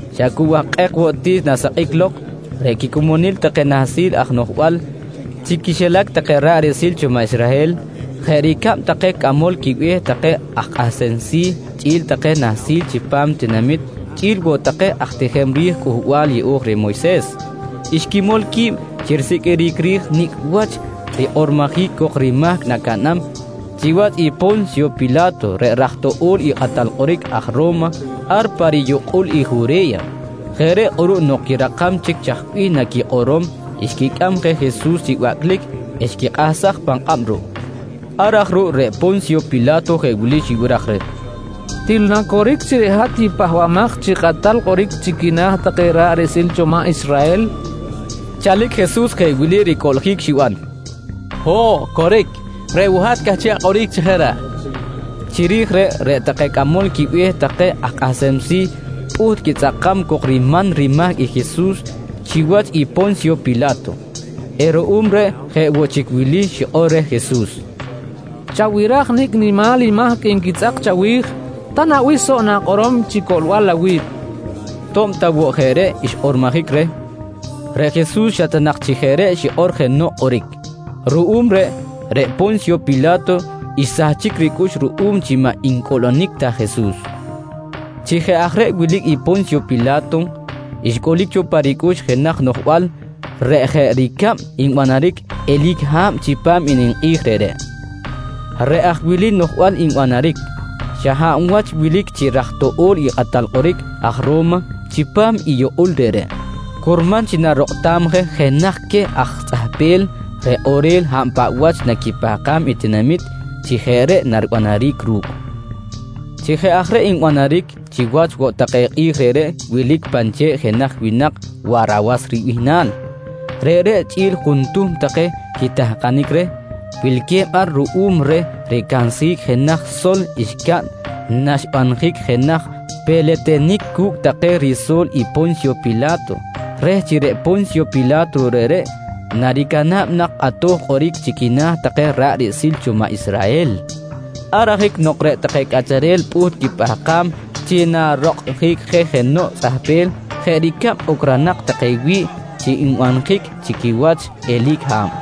Xa cu wahkꞌek woꞌ ti naxsakꞌic lok, reꞌ quicomonil take nahsil aj noꞌjbal chi quixilac take ra̱ꞌ riꞌsil cho maꞌ Israhel jeꞌ ricab take cꞌamol quibe̱h take aj kꞌahsem si̱ chꞌi̱l take nahsil chipam tinamit chꞌi̱l woꞌ take aj tijem ri̱j Cꞌuhbal Yeꞌo̱j reh Moyses, xquimol qui̱b chi risiqꞌuiric ri̱j nicꞌ wach rikꞌormojic cok rimahc nacaꞌnam chiwach i Po̱nsyo Pila̱to reꞌ raj toꞌo̱l i kꞌatal kꞌoric aj Ro̱ma ar pa riyukꞌul i Jure̱ya. Jeꞌ reꞌ kꞌuruꞌ nok quirakam chic chaj bih naquikꞌorom, xquicꞌam je Jesus chi bacꞌlic eh xquikꞌahsaj pan kꞌab ruꞌ. Ar aj ruꞌ reꞌ Po̱nsyo Pila̱to jeꞌ wili xibiraj reh: «Til na coric chi reꞌ hat i Pahbamaj chi Kꞌatal Kꞌoric chi quina̱ take ra̱ꞌ riꞌsil cho maꞌ Israhel? nqui reh. Chalic Jesus jeꞌ wili ricꞌuꞌljic xiban: «Ho̱ꞌ, coric. Reꞌ woꞌ hat cꞌahchiꞌ akꞌoric chi jeꞌ reꞌ, nqui reh. Chiri̱j reꞌ, reꞌ take cꞌamol quibe̱h take aj kꞌahsem si̱ pꞌuht quitzꞌakam cok riman rimahc i Jesus chiwach i Po̱nsyo Pila̱to eh ruꞌum reꞌ, jeꞌ woꞌ chic wili xikꞌor reh i Jesus: «Chabiraj nicꞌ nimal i mahc nquitzꞌak chawi̱j, ta na bih soꞌ na̱kꞌorom chi coꞌlbal awi̱b? nqui reh. To̱b ta woꞌ jeꞌ reꞌ xkꞌormojic reh, reꞌ Jesus xa ta nak chi jeꞌ reꞌ xikꞌor jenoꞌ kꞌoric. Ruꞌum reꞌ, reꞌ Po̱nsyo Pila̱to xsahchic ricꞌux ruꞌum chi maꞌ ncꞌuꞌlunic ta Jesus. Chi jeꞌ aj reꞌ wilic i Po̱nsyo Pila̱to, xcꞌulic cho pa ricꞌux jenaj noꞌjbal reꞌ jeꞌ ricab nbanaric eli̱c i ha̱b chipam i ninkꞌi̱j reꞌreꞌ. Reꞌ aj wili noꞌjbal nbanaric: Xa hab wach wilic chi raj toꞌo̱l i kꞌatal kꞌoric aj Ro̱ma chipam i yukꞌul reꞌreꞌ, curman chi narokꞌtam je jenaj queh aj tzꞌahpel reꞌ kꞌorel hab paꞌ wach naquipahkam i tinamit chi jeꞌ reꞌ naribanaric ru̱cꞌ. Chi jeꞌ aj reꞌ nbanaric, chiwach woꞌ take kꞌi̱j reꞌreꞌ wilic pan che̱ꞌ jenaj winak Warawas ribihnal. Reꞌreꞌ chꞌi̱l juntuhm take quitahkanic reh, wilque̱b ar ruꞌum reh ricansjic jenaj sol xcaꞌn naxbanjic jenaj peletenic cu̱cꞌ take riso̱l i Po̱nsyo Pila̱to reh chi reꞌ Po̱nsyo Pila̱to reꞌreꞌ naricana̱b nak kꞌatoj kꞌoric chi quina̱ take ra̱ꞌ riꞌsil cho maꞌ Israhel. Ar ajic nok reꞌ take cꞌacharel pꞌuht quipahkam chi narokꞌtjic je jenoꞌ tzꞌahpel jeꞌ ricab ocronak take wi̱ꞌ chi nbanjic chi quiwach eli̱c i ha̱b,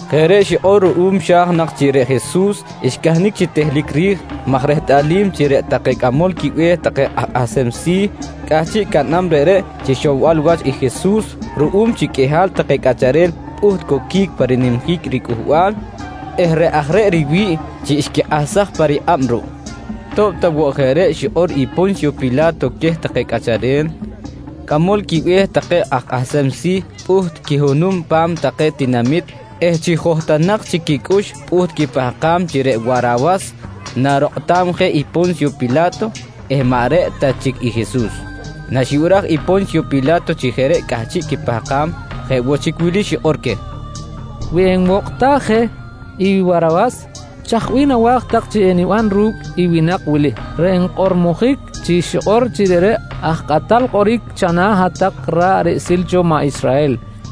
Jeꞌ reꞌ xikꞌor ruꞌum xa̱j nak chi reꞌ Jesus xcahnic chi tehlic ri̱j maj rehtꞌalim chi reꞌ take cꞌamol quibe̱h take aj kꞌahsem si̱ cꞌahchiꞌ caꞌnam reꞌreꞌ chi ixowbal wach i Jesus ruꞌum chi qꞌuihal take cꞌacharel pꞌuht coquic pa rinimjic riCꞌuhbal eh reꞌ aj reꞌ riwi̱ꞌ chi xquikꞌahsaj pa rikꞌab ruꞌ. To̱b ta woꞌ jeꞌ reꞌ xikꞌor i Po̱nsyo Pila̱to queh take cꞌacharel, cꞌamol quibe̱h take aj kꞌahsem si̱ pꞌuht quihunum pa̱m take tinamit eh chi johtonak chic quicꞌux pꞌuht quipahkam chi reꞌ Warawas narokꞌtam je i Po̱nsyo Pila̱to eh maꞌ reꞌ ta chic i Jesus. Naxibiraj i Po̱nsyo Pila̱to chi jeꞌ reꞌ cꞌahchiꞌ quipahkam, jeꞌ woꞌ chic wili xikꞌor queh: «Wi enwokꞌtaj je i Warawas, chaj bih nawa̱j tak chi eniban ru̱cꞌ i winak wili reꞌ nkꞌormojic chi xikꞌor chi reꞌreꞌ i aj kꞌatal kꞌoric chana̱ hat-tak ra̱ꞌ riꞌsil cho maꞌ Israhel? nqui queh.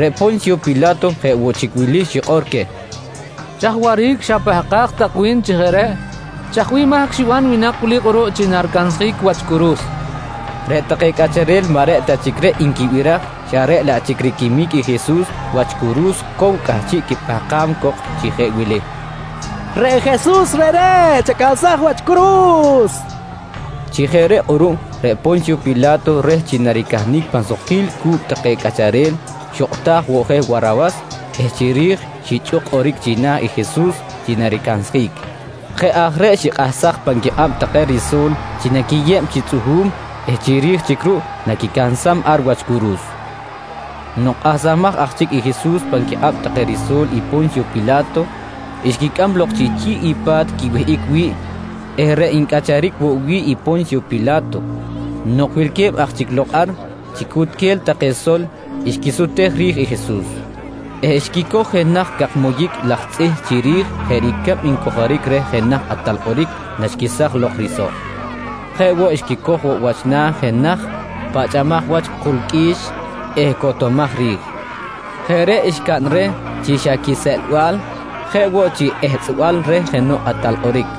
Reꞌ Po̱nsyo Pila̱to jeꞌ woꞌ chic wili xikꞌor queh: «Chaj waꞌric xapahkaj tak wi̱n chi jeꞌ reꞌ? Chaj bih mahc xiban i winak wili kꞌuruꞌ chi naricansjic wach curu̱s? nqui queh. Reꞌ take cꞌacharel maꞌ reꞌ ta chic reꞌ nquibiraj xa reꞌ laꞌ chic riquimic i Jesus wach curu̱s cow cꞌahchiꞌ quipahkam cok chi jeꞌ wili: «Reꞌ Jesus reꞌreꞌ chacansaj wach curu̱s! nqui take. Chi jeꞌ reꞌ kꞌuruꞌ reꞌ Po̱nsyo Pila̱to reh chi naricahnic pan sukquil cu̱cꞌ take cꞌacharel, xokꞌtaj woꞌ je Warawas eh chiri̱j xichꞌuk kꞌoric china̱ i Jesus chi naricansjic. Jeꞌ aj reꞌ xikꞌahsaj pan quikꞌab take riso̱l chi naquiyeb chi tzꞌuhu̱m eh chiri̱j chic ruꞌ naquicansam ar wach curu̱s. Nok kꞌahsamaj aj chic i Jesus pan quikꞌab take riso̱l i Po̱nsyo Pila̱to, xquicꞌam lok chi chi̱ꞌ i pa̱t quiwihꞌic wi̱ꞌ eh reꞌ ncꞌacharic woꞌ wi̱ꞌ i Po̱nsyo Pila̱to. Nok wilque̱b aj chic lok ar, chi cunchelal take sol xquisutej ri̱j i Jesus eh xquicoj jenaj cak moyic laj tzꞌih chiri̱j jeꞌ ricab ncojoric reh jenaj kꞌatal kꞌoric naxquesaj lok i risoꞌ. Jeꞌ woꞌ xquicoj woꞌ wach na̱ jenaj pachꞌamaj wach ku̱l qꞌui̱x eh cotomaj rij. Jeꞌ reꞌ xcaꞌn reh chi xa quiseꞌlbal jeꞌ woꞌ chi ehtzꞌbal reh jenoꞌ kꞌatal kꞌoric.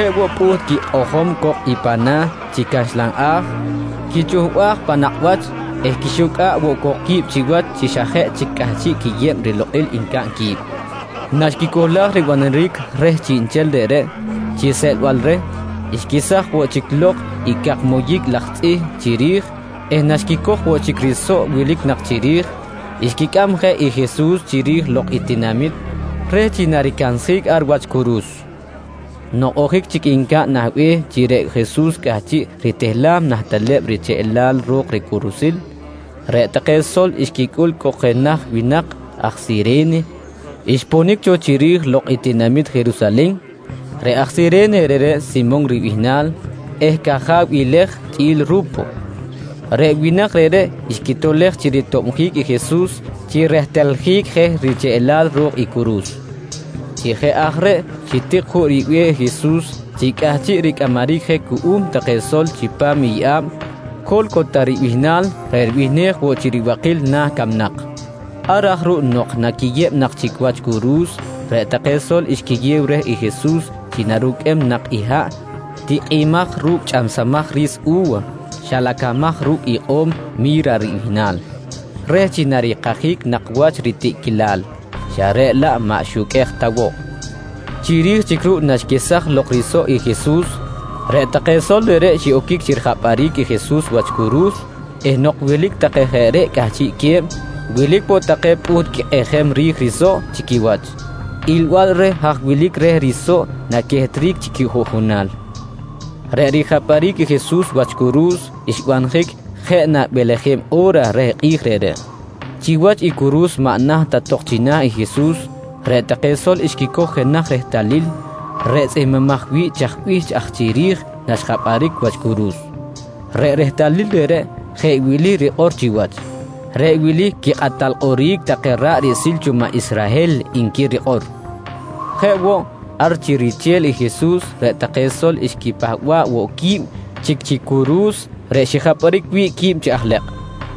Jeꞌ woꞌ, pꞌuht quikꞌojom cok i pana̱ chi caxlan a̱j, quichuhbaj pan nakꞌ wach eh xquixucꞌa̱ꞌ woꞌ qui̱b chiwach chi xa jeꞌ chic cꞌahchiꞌ quiyeb rilokꞌil nancaꞌn qui̱b. Naxquicohlaj ribanaric reh chiꞌnchel reꞌreꞌ chi seꞌlbal reh, xquesaj woꞌ chic lok i cak moyic laj tzꞌih chiri̱j eh naxquicoj woꞌ chic i risoꞌ wilic nak chiri̱j, xquicꞌam je i Jesus chiri̱j lok i tinamit reh chi naricansjic ar wach curu̱s. Nok ojic chic ncaꞌn nah be̱h chi reꞌ Jesus cꞌahchiꞌ ritehlam nah teleb richeꞌlal ro̱k ricurusil, reꞌ take sol xquicꞌul cok jenaj winak aj Sire̱ne xponic cho chiri̱j lok i tinamit Jerusalen. Reꞌ aj sire̱ne reꞌreꞌ Simon ribihnal eh caja̱w i Lej chꞌi̱l Ru̱po. Reꞌ winak reꞌreꞌ, xquitolej chi ritobjic i Jesus chi ritehljic je richeꞌlal ro̱k i curu̱s. Chi jeꞌ aj reꞌ xitik juꞌ ribe̱h i Jesus chi cꞌahchiꞌ ricꞌamaric jeꞌ cuꞌum take sol chipam i yeꞌa̱b “Co̱lcota” ribihnal reꞌ ribihnej woꞌ chi “riBakil Na̱ Camnak”. Ar aj ruꞌ nok naquiyeb nak chic wach curu̱s, reꞌ take sol xquiyew reh i Jesus chi naruqꞌuem nak i haꞌ tikꞌimaj ru̱cꞌ chꞌamsamaj ri̱s u̱wa xilacamaj ru̱cꞌ ikꞌo̱m “Mi̱ra” ribihnal reh chi narikajic nak wach ritiꞌquilal, xa reꞌ laꞌ maꞌ xuqꞌuej ta woꞌ. Chiri̱j chic ruꞌ naxquesaj lok risoꞌ i Jesus, reꞌ take sol reꞌreꞌ xiꞌoquic chi rijapꞌaric i Jesus wach curu̱s eh nok wilic take jeꞌ reꞌ cꞌahchiꞌque̱b, wilic woꞌ take pꞌuht quikꞌijem ri̱j risoꞌ chi quiwach, ilbal reh haj wilic reh risoꞌ naquehtric chi quijuꞌjunal. Reꞌ rijapꞌaric i Jesus wach curu̱s xbanjic jeꞌ na beleje̱b o̱ra reh kꞌi̱j reꞌreꞌ. Chiwach i curu̱s maꞌ naht ta tok china̱ i Jesus, reꞌ take sol xquicoj jenaj rehtalil reꞌ tzꞌihmbimaj wi̱ꞌ chaj bih aj chiri̱j naxjapꞌaric wach curu̱s. Reꞌ rehtalil reꞌreꞌ jeꞌ wili rikꞌor chiwach: “Reꞌ wili quikꞌatal kꞌoric take ra̱ꞌ riꞌsil cho maꞌ Israhel, nqui rikꞌor. Jeꞌ woꞌ, ar chi riche̱l i Jesus reꞌ take sol, xquipahba̱ꞌ woꞌ quib chic chi curu̱s reꞌ xijapꞌaric wi̱ꞌ quib chi aj lekꞌ.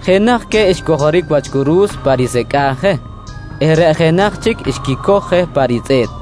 Jenaj queh xcojoric wach curu̱s pa nisecꞌa̱j je eh reꞌ jenaj chic xquicoj je pa ritzꞌe̱t.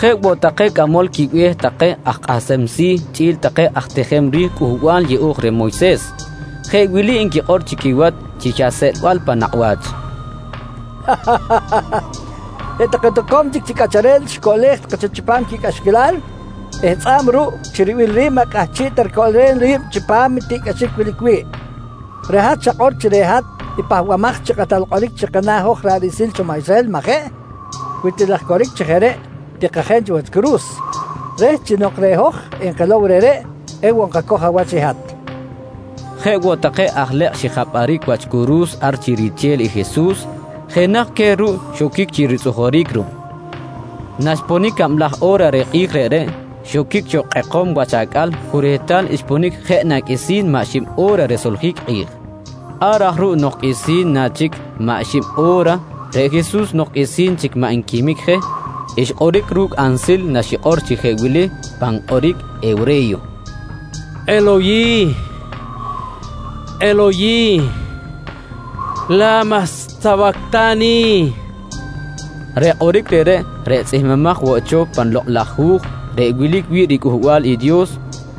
Jeꞌ woꞌ take cꞌamol quibe̱h take aj kꞌahsem si̱ chꞌi̱l take aj tijem ri̱j Cꞌuhbal Yeꞌo̱j reh Moyses, jeꞌ wili nquikꞌor chi quiwach chi xa seꞌlbal pan nakꞌ wach: «Reꞌ take toco̱m chic cꞌacharel xicoꞌlej take cho chipam quicꞌaxquilal eh tzꞌa̱b ruꞌ chi ribil ri̱b maꞌ cꞌahchiꞌ ta ricoꞌlem ri̱b chipam i tiꞌcꞌaxic wilic wi̱ꞌ. Reꞌ hat xakꞌor chi reꞌ hat i Pahbamaj chi Kꞌatal Kꞌoric chi kana̱ hoj ra̱ꞌ riꞌsil cho maꞌ Israhel, majeꞌ? Wi til aj coric chi jeꞌ reꞌ, tikajen cho wach curu̱s reh chi nok reꞌ hoj enkilow reꞌreꞌ ewoꞌ nkacoj awach i hat, nqui take reh. Jeꞌ woꞌ take aj lekꞌ xijapꞌaric wach curu̱s ar chi riche̱l i Jesus, jenaj queh ruꞌ xoquic chi ritzꞌujuric ruꞌ. Naxponic cablaj o̱ra reh kꞌi̱j reꞌreꞌ, xoquic cho kꞌekom wach acꞌal cu rehtal xponic jeꞌ na qꞌuisi̱n maꞌ xib o̱ra risoljic i kꞌi̱j. Ar aj ruꞌ nok qꞌuisi̱n na chic maꞌ riban xib o̱ra reꞌ Jesus nok qꞌuisi̱n chic maꞌ nquimic je, xkꞌoric ru̱cꞌ ansil naxikꞌor chi jeꞌ wili pan kꞌoric hewre̱yo: «Eloyih, Eloyih, la̱ma sawacta̱ni? nqui xikꞌor. Reꞌ kꞌoric reꞌreꞌ, reꞌ tzꞌihmbimaj woꞌ cho pan Lokꞌ laj Hu̱j reꞌ wilic wi̱ꞌ riCꞌuhbal i Dios,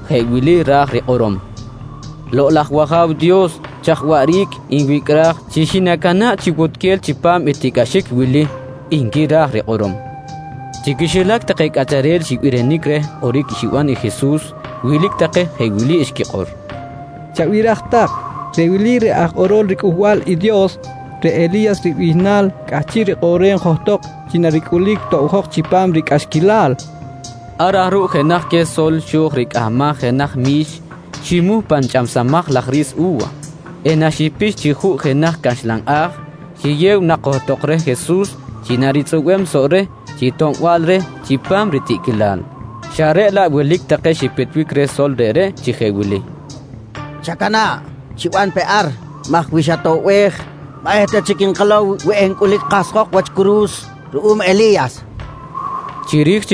jeꞌ wili ra̱j rikꞌorom: “Lokꞌ laj wAja̱w Dios, chaj waꞌric nwicꞌraj chi xinacana̱ꞌ chi wutquel chipam i tiꞌcꞌaxic wili? nqui ra̱j rikꞌorom. Chi quixilac take cꞌacharel xibirinic reh kꞌoric xiban i Jesus, wilic take jeꞌ wili xquikꞌor: «Chabiraj tak, reꞌ wili reꞌ aj kꞌorol riCꞌuhbal i Dios, reꞌ Eli̱yas ribihnal cꞌahchiꞌ rikꞌoꞌrem johtok chi naricꞌulic tobjok chipam ricꞌaxquilal, nqui take. Ar aj ruꞌ jenaj queh sol xo̱j ricꞌahmaj jenaj mi̱x, ximuh pan chꞌamsamaj laj ri̱s u̱wa eh naxipix chi juꞌ jenaj caxlan a̱j, xiyew nak johtok reh Jesus chi naritzꞌubem soꞌ reh chi toꞌbal reh chipam ritiꞌquilal, xa reꞌ laꞌ wilic take xipitbic reh sol reꞌreꞌ chi jeꞌ wili: «Chacana̱ꞌ, chiban pe ar maj wi xatoꞌbej maꞌ eta chic nkilow wi encꞌulic kahsjok wach curu̱s ruꞌum Eli̱yas, nqui take reh.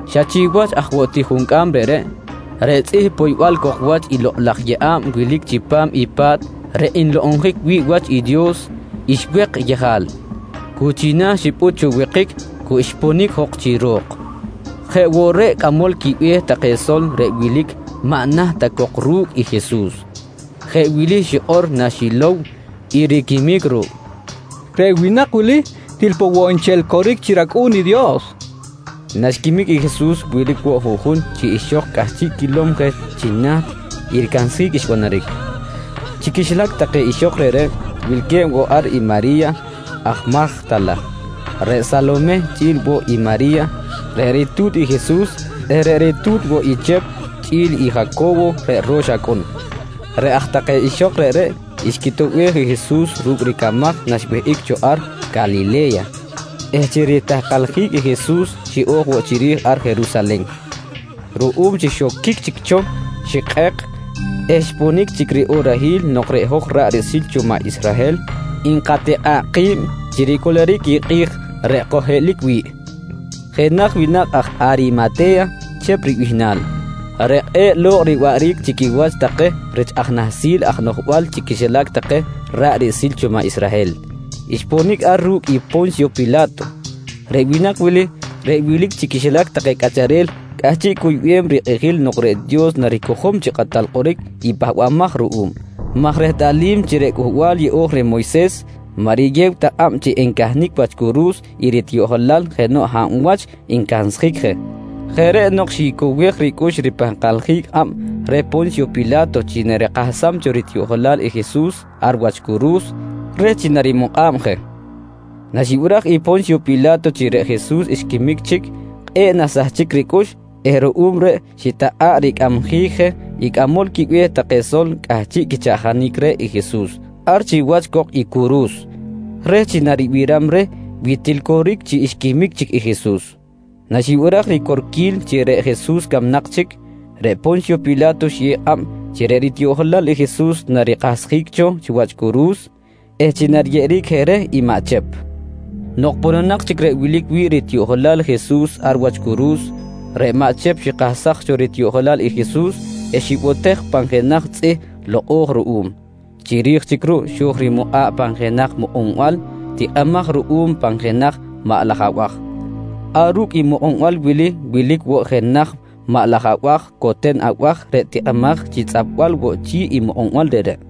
Xa chiwach aj woꞌ juncꞌam reꞌreꞌ, reꞌ tzꞌih poybal cok wach i lokꞌ laj yeꞌa̱b wilic chipam i pa̱t reꞌ nlokꞌonjic wi̱ꞌ wach i Dios xwek yejal, cu china̱ xipꞌut cho wekic cu xponic jok chi ro̱k. Jeꞌ woꞌ, reꞌ cꞌamol quibe̱h take sol reꞌ wilic maꞌ naht ta cok ru̱cꞌ i Jesus, jeꞌ wili xikꞌor naxilow i riquimic ruꞌ: «Reꞌ winak wili til poꞌ woꞌ nchel coric chi rAcꞌu̱n i Dios, nqui xikꞌor. Naxquimic i Jesus wilic woꞌ juꞌjun chi ixok cꞌahchiꞌ quilom je chi naht i ricansjic xbanaric. Chi quixilac take ixok reꞌreꞌ, wilque̱b woꞌ ar i Mari̱ya aj Majta̱la, reꞌ Salomeh chꞌi̱l woꞌ i Mari̱ya reꞌ ritu̱t i Jesus eh ritu̱t woꞌ i Chep chꞌi̱l i Jaco̱wo reꞌ ro̱x acꞌun. Reꞌ aj take ixok reꞌreꞌ xquitoꞌbej i Jesus ru̱cꞌ ricamaj naxwihꞌic cho ar Calile̱ya eh chi ritahkaljic i Jesus xiꞌo̱j woꞌ chiri̱j ar Jerusalen. Ruꞌum chi xoquic chic cho xikꞌek eh xponic chic riꞌorahil nok reꞌ hoj ra̱ꞌ riꞌsil cho maꞌ Israhel nkatikꞌa̱ꞌ ki̱b chi ricꞌuluric i kꞌi̱j reꞌ kojhiꞌilic wi̱ꞌ, jenaj winak aj Arimate̱ya Chep ribihnal, reꞌ kꞌe̱ꞌ lo̱kꞌ riwaꞌric chi quiwach take rich aj nahsil aj noꞌjbal chi quixilac take ra̱ꞌ riꞌsil cho i maꞌ Israhel, xponic ar ru̱cꞌ i Po̱nsyo Pila̱to. Reꞌ winak wili, reꞌ wilic chi quixilac take cꞌacharel cꞌahchiꞌ cuyꞌem rikꞌijil nok reꞌ Dios naricojom chi Kꞌatal Kꞌoric i pahbamaj ruꞌum, maj rehtꞌalim chi reꞌ Cꞌuhbal Yeꞌo̱j reh Moyses maꞌ riyew ta kꞌab chi encahnic wach curu̱s i ritiꞌjolal jenoꞌ hab wach ncansjic je. Jeꞌ reꞌ nok xicowej ricꞌux chi ripahkaljic kꞌab reh Po̱nsyo Pila̱to chi narikahsam cho ritiꞌjolal i Jesus ar wach curu̱s reh chi narimukꞌa̱b je. Naxibiraj i Po̱nsyo Pila̱to chi reꞌ Jesus xquimic chic, kꞌe̱ꞌ naxsahchic ricꞌux eh ruꞌum reꞌ xitakꞌa̱ꞌ ricꞌamjic je i cꞌamol quibe̱h take sol cꞌahchiꞌ quichaꞌjanic reh i Jesus ar chiwach cok i curu̱s, reh chi naribiram reh wi til woꞌ coric chi xquimic chic i Jesus. Naxibiraj ricorquil chi reꞌ Jesus camnak chic, reꞌ Po̱nsyo Pila̱to xiyew kꞌab chi reꞌ ritiꞌjolal i Jesus narikahsjic cho wach curu̱s eh chi nariyeꞌeric je reh i maꞌ Chep. Nok pononak chic reꞌ wilic wi̱ꞌ ritiꞌjolal Jesus ar wach curu̱s, reꞌ maꞌ Chep xikahsaj cho ritiꞌjolal i Jesus eh xibotej pan jenaj tzꞌih lokꞌo̱j ruꞌum. Chiri̱j chic ruꞌ, xo̱j rimukꞌa̱ꞌ pan jenaj mukꞌunbal tikꞌimaj ruꞌum pan jenaj maꞌ laj abaj. Ar ru̱cꞌ i mukꞌunbal wili wilic woꞌ jenaj maꞌ laj coten abaj reꞌ tikꞌimaj chi tzꞌapbal woꞌ chi̱ꞌ i mukꞌunbal reꞌreꞌ.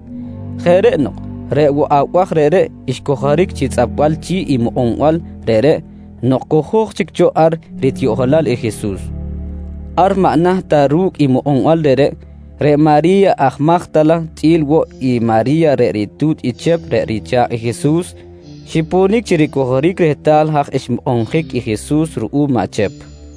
Jeꞌ reꞌ nok reꞌ woꞌ abaj reꞌreꞌ xcojoric chi tzꞌapbal chi̱ꞌ i mukꞌunbal reꞌreꞌ nok cojo̱j chic cho ar i ritiꞌjolal i Jesus. Ar maꞌ naht ta ru̱cꞌ i mukꞌunbal reꞌreꞌ, reꞌ Mari̱ya aj Majta̱la chꞌi̱l woꞌ i Mari̱ya reꞌ ritu̱t i Chep reꞌ richa̱kꞌ i Jesus, xiponic chi ricojoric rehtal haj xmukꞌunjic i Jesus ruꞌum maꞌ Chep.